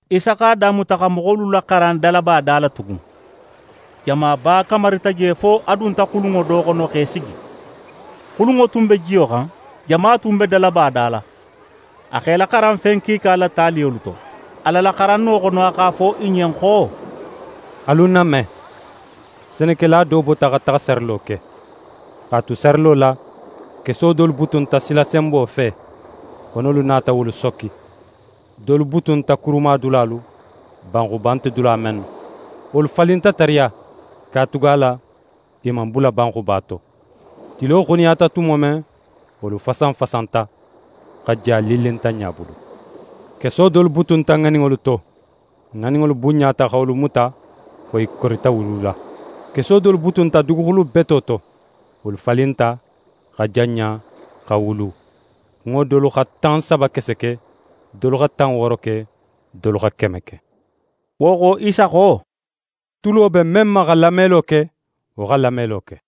Isa x'a damuta xa moxolu laxaran dalaba da la tugun. Jamaba kamarita je fo a dunta xulunŋo do xono x'é sigi. Xulunŋo tun be jiyo xan, jama tun be dalaba da la. A x'e laxaran fen kiika la taliyolu to. A la laxaranno xono a x'a fo i ɲen xo: «Alu ń name: Senekela do bota xa taxa sarilo ke. X'a tu sarilo la, keso dolu butunta silasenbo fe. Xonolu nata wolu sokki. Dolu butunta kurumadulalu, banxuba nte dula mennu. Wolu falinta tariya, katugala i man bula banxuba to. Tilo xuniyata tumo men, wolu fasanfasanta, xa ja lillintanɲa bulu. Keso dolu butunta ŋaninŋolu to, ŋaninŋolu bunɲata xa wolu muta, fo i korita wulula. Keso dolu butunta duguxulu beto to; wolu falinta, xa janɲa, xa wulu. Kunŋo dolu xa tan saba kese ke, dolu xa tan wooro ke, dolu xa keme ke.» Wo xo, Isa xo: «Tulo be men ma xa lamelo ke, wo xa lamelo ke!»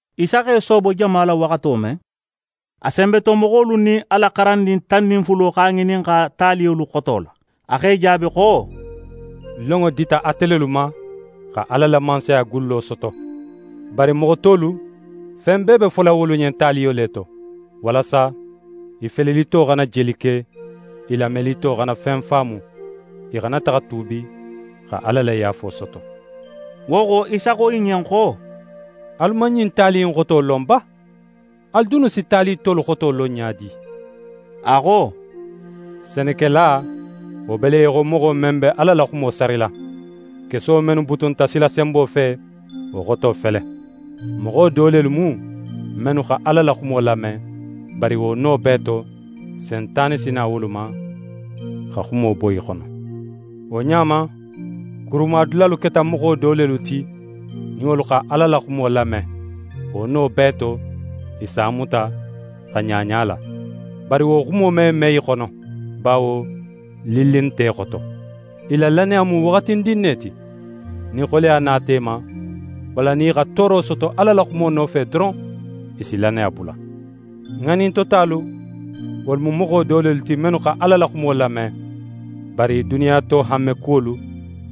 Isa x'e soobo jama la waxato men, a senbetomoxolu nin a la xarandin tan nin fulo x'a ŋininxa taliyolu xoto la. A x'e jaabi xo: «Lonŋo dita ate lelu ma, xa Ala la Mansaya gullo soto. Bari moxo tolu, fen bee be fola wolu ɲen taliyo le to, walasa: “i felelito xana jeli ke, i lamelito xana fen faamu; i xana taxa tuubi, xa Ala la yaafo soto.”» Wo xo, Isa xo i ɲen xo: «Alu man ɲin tali in xoto lon ba? Alu dunnu si tali tolu xoto lon ɲa di?» A xo: «Senekela, wo be le í xo moxo men be Ala la xumo sarila. Keso mennu butunta silasenbo fe, wo xoto fele: Moxo do lelu mu, mennu xa Ala la xumo lame, bari wo no bee to Sentane si na wolu ma, xa xumo bo i xono. Wo ɲa ma, kurumadulalu keta moxo do lelu ti, nin wolu xa Ala la xumo lame, wo no bee to, i s'a muta, xa ɲaɲa a la. Bari wo xumo me me i xono, bawo lilli nte i xoto. I la lannaya mu waxatindin ne ti. Nin xoleya nata i ma, walla nin i xa tooro soto Ala la xumo nofe doron, i si lannaya bula. Ŋanintotalu, wolu mu moxo do lelu ti, mennu xa Ala la xumo lame, bari duniya to hanmekuwolu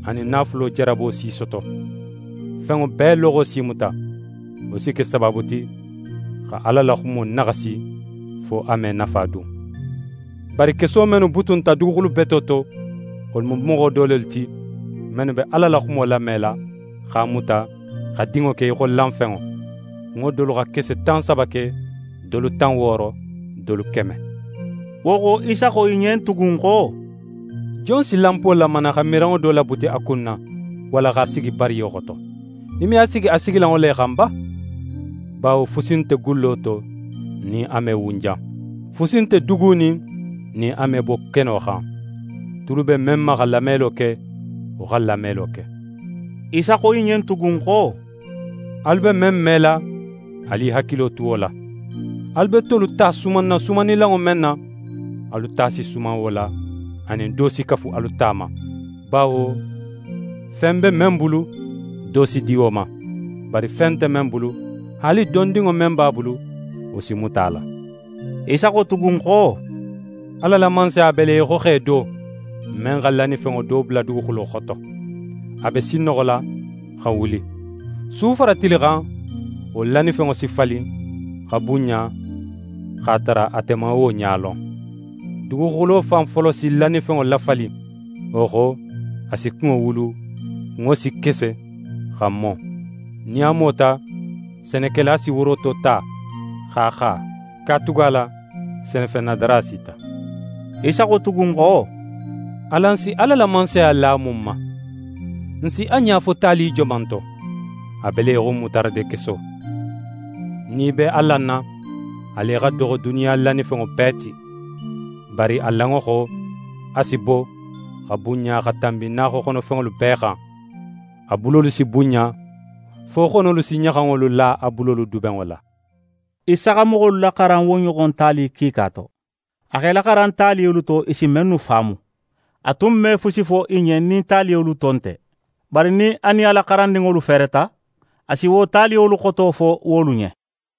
anin naafulo jarabo si i soto. Fenŋo bee loxo s'i muta. Wo si ke sabaabu ti, xa Ala la xumo naxasi, fo a me nafa dun. Bari keso mennu butunta duguxulu beto to, wolu mu moxo do lelu ti, mennu be Ala la xumo lamela, x'a muta, xa dinŋo ke í xo lanfenŋo. Kunŋo dolu xa kese tan saba ke, dolu tan wooro, dolu keme.» Wo xo, Isa xo i ɲen tugun xo: «Jon si lanpo lamana xa miranŋo do labuti a kunna, walla x'a sigi bariyo xoto? I me a sigi a sigilanŋo le xan ba? Bawo fusi nte gullo to nin a me wunjan. Fusi nte dugunin nin a me bo keno xan. Tulu be men ma xa lamelo ke, wo xa lamelo ke.» Isa xo i ɲen tugun xo: «Alu be men mela, alu i hakilo tu wo la. Alu be tolu ta sumanna sumannilanŋo men na, alu ta si suman wo la, anin, do si kafu alu ta ma. Bawo fen be men bulu, do si di wo ma; bari fen nte men bulu, haali dondinŋo men b'a bulu, wo si muta a la.» Isa xo tugun xo: «Ala la Mansaya be le í xo xe do, men xa lannifenŋo do bula duguxulo xoto. A be sinnoxola, xa wuli: Su fara tili xan, wo lannifenŋo si falin, xa bunɲa, x'a tara ate man wo ɲa lon. Duguxulo fan folo si lannifenŋo lafalin, wo xo, a si kunŋo wulu, kunŋo si kese, xa mo. Nin a mota, senekela si woroto ta, x'a xa, katugala senefennadara sita.» Isa xo tugun xo: «Alan si Ala la Mansaya la mun ma? N si a ɲa fo tali joman to? A be le í xo mutaradekeso. Nin í be a lanna, a le xa doxo duniya lannifenŋolu bee ti. Bari a lanŋo xo, a si bo, xa bunɲa xa tanbi naaxoxonofenŋolu bee xan. A bulolu si bunɲa, fo xonolu si ɲaxanŋolu la a bulolu dubenŋo la.» Isa xa moxolu laxaran wo ɲoxon tali kiika to. A x'e laxaran taliyolu to, i si mennu faamu. A tun me fusi fo i ɲen nin taliyolu to nte. Bari nin a nin a la xarandinŋolu fereta, a si wo taliyolu xoto fo wolu ɲen.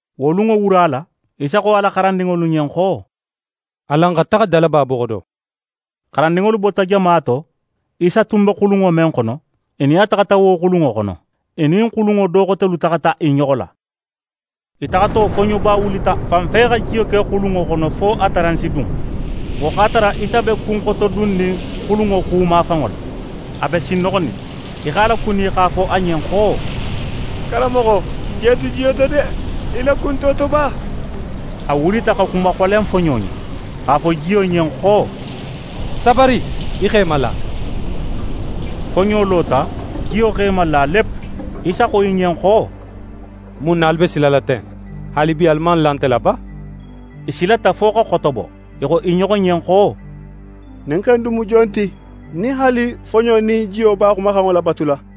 Wo lunŋo wura la, Isa xo a la xarandinŋolu ɲen xo: «Alan xa taxa dalaba boxo do.» Xarandinŋolu bota jama to; Isa tun be xulunŋo men xono, i nin a taxata wo xulunŋo xono. I nin xulunŋo do xotelu taxata i ɲoxo la. I taxato, foɲoba wulita, fanfe xa jiyo ke xulunŋo xono, fo a taran si dun. Wo x'a tara Isa be kunxotodunnin xulunŋo xumafanŋo la, a be sinnoxonin. I x'a lakuni, x'a fo a ɲen xo: «Karanmoxo, n je tu jiyo to de! Í la ku nte wo to ba?» A wulita xa xuma xolen foɲo ɲen, x'a fo jiyo ɲen xo: «Sabari, í x'é mala.» Foɲo lota; jiyo x'é mala lep. Isa xo i ɲen xo: «Mun na alu be silala ten; haalibi alu man la nte la ba?» I silata fo xa xotobo. I xo i ɲoxo ɲen xo: «Ɲin xe in dun mu jon ti, nin haali foɲo nin jiyo b'a xumaxanŋo labatula?»